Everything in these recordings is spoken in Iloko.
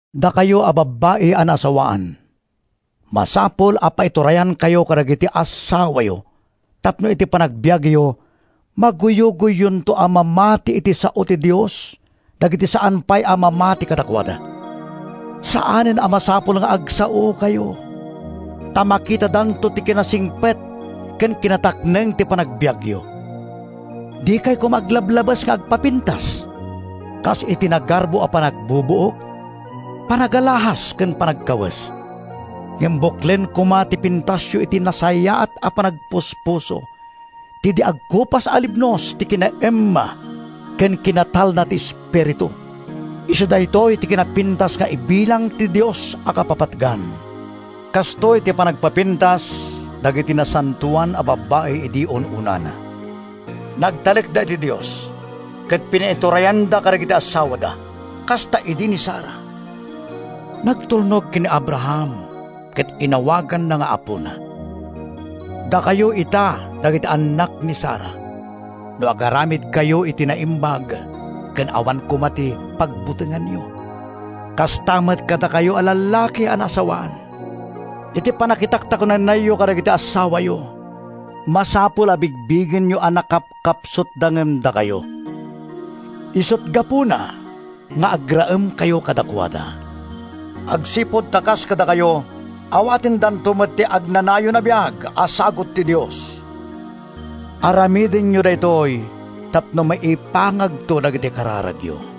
Dakayo a babbai a naasawaan, masapul a paiturayankayo kadagiti assawayo tapno iti panagbiagyo, maguyugoyyonto a mamati iti sao ti Dios dagiti saan pay a mamati kadakuada. Saanen a masapul nga agsaokayo ta makitadanto ti kinasingpet ken kinatakneng ti panagbiagyo. Dikay koma aglablabes nga agpapintas kas iti nagarbo a panagbubuok, panagalahas ken panagkawes. Ngem buklen koma ti pintasyo iti nasayaat a panagpuspuso, ti di agkupas a libnos ti kinaemma ken kinatalna ti espiritu. Isu daytoy ti kinapintas nga ibilang ti Dios a kapapatgan. Kastoy ti panagpapintas dagiti nasantoan a babbai idi un-unana: nagtalekda iti Dios ket pinaiturayanda kadagiti assawada. Kasta idi ni Sara. Nagtulnog ken ni Abraham ket inawaganna nga apona. Dakayo ita dagiti annak ni Sara no agaramidkayo iti naimbag ken awan koma ti pagbutengan-yo. Kasta met kadakayo a lallaki a naasawaan. Iti pannakitaktakunaynayyo kadagiti assawayo, masapul a bigbigenyo a nakapkapsutda ngem dakayo. Isut’ gapuna nga agraemkayo kadakuada, agsipud ta kas kadakayo, awatendanto met ti agnanayon a biag a sagut ti Dios. Aramidenyo daytoy tapno maipangagto dagiti kararagyo.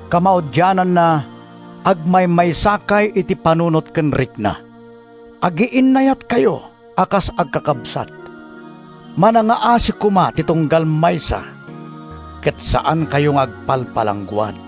Kamaudiananna, agmaymaysakay iti panunot ken rikna. Agiinnayatkayo a kas agkakabsat. Manangngaasi koma ti tunggal maysa ket saankayo nga agpalpalangguad.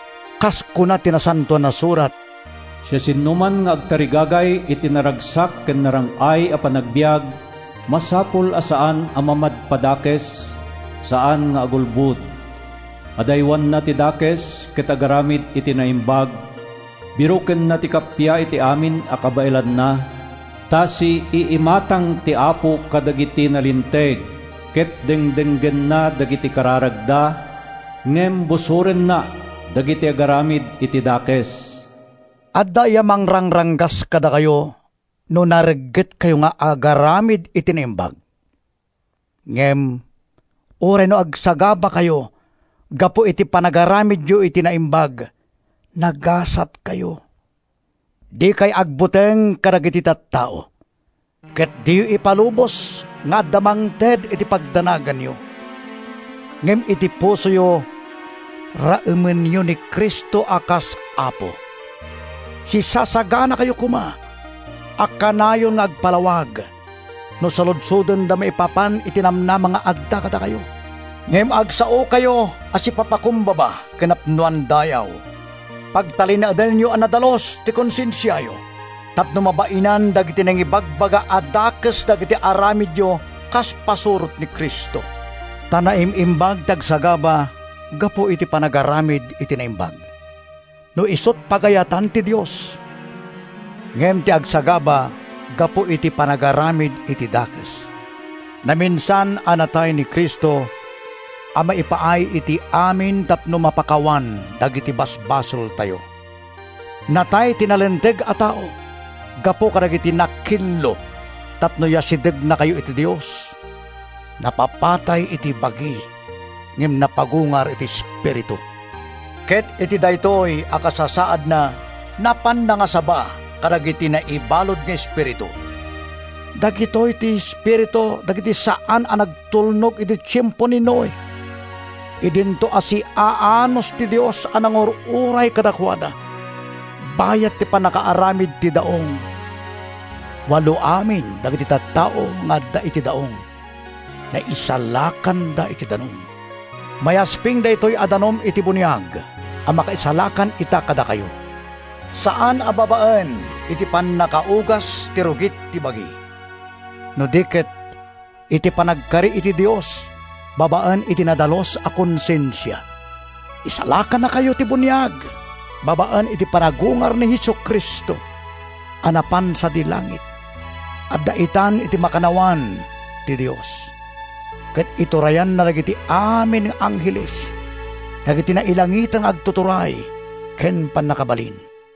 Kas kuna ti Nasantoan a Surat: “Siasinoman nga agtarigagay iti naragsak ken narang-ay a panagbiag, masapul a saan a mamadpadakes, saan nga agulbod. Adaywanna ti dakes ket agaramid iti naimbag. Birokenna ti kappia iti amin a kabaelanna. Ta siiimatang ti Apo kadagiti nalinteg, ket dengdenggenna dagiti kararagda; ngem busorenna dagiti agaramid iti dakes.” Adda aya mangranggas kadakayo no nareggetkayo nga agaramid iti naimbag? Ngem uray no agsagabakayo gapu iti panagaramidyo iti naimbag, nagasatkayo. Dikay agbuteng kadagiti tattao. Ket diyo ipalubos nga adda mangted iti pagdanaganyo. Ngem iti pusoyo, raemenyo ni Cristo a kas Apo. Sisasaganakayo koma a kanayon nga agpalawag no saludsodenda maipapan iti namnama nga adda kadakayo, ngem agsaokayo a sipapakumbaba ken napnoan dayaw. Pagtalinaedenyo a nadalus ti konsensiayo tapno mabainan dagiti nangibagbaga a dakes dagiti aramidyo kas pasurot ni Cristo. Ta naim-imbag ti agsagaba gapu iti panagaramid iti naimbag, no isut’ pagayatan ti Dios, ngem ti agsagaba gapu iti panagaramid iti dakes. Naminsan a natay ni Cristo a maipaay iti amin tapno mapakawan dagiti basbasoltayo. Natay ti nalinteg a tao gapu kadagiti nakillo tapno yasidegnakayo iti Dios. Napapatay iti bagi ngem napagungar iti espiritu, ket iti daytoy a kasasaadna napan nangasaba kadagiti naibalud nga espiritu. Dagitoy ti espiritu dagiti saan a nagtulnog idi tiempo ni Noe idinto a siaanus ti Dios a nangur-uray kadakuada bayat ti pannakaaramid ti daong. Walo amin dagiti tattao nga adda iti daong. Naisalakanda iti danum. Mayasping daytoy a danum iti buniag a makaisalakan ita kadakayo. Saan a babaen iti pannakaugas ti rugit ti bagi, no di ket iti panagkari iti Dios babaen iti nadalus a konsensia. Isalakannakayo ti buniag babaen iti panagungar ni Jesu-Cristo a napan sadi langit. Adda itan iti makannawan ti Dios, ket iturayanna dagiti amin nga angheles, dagiti nailangitan nga agtuturay ken pannakabalin.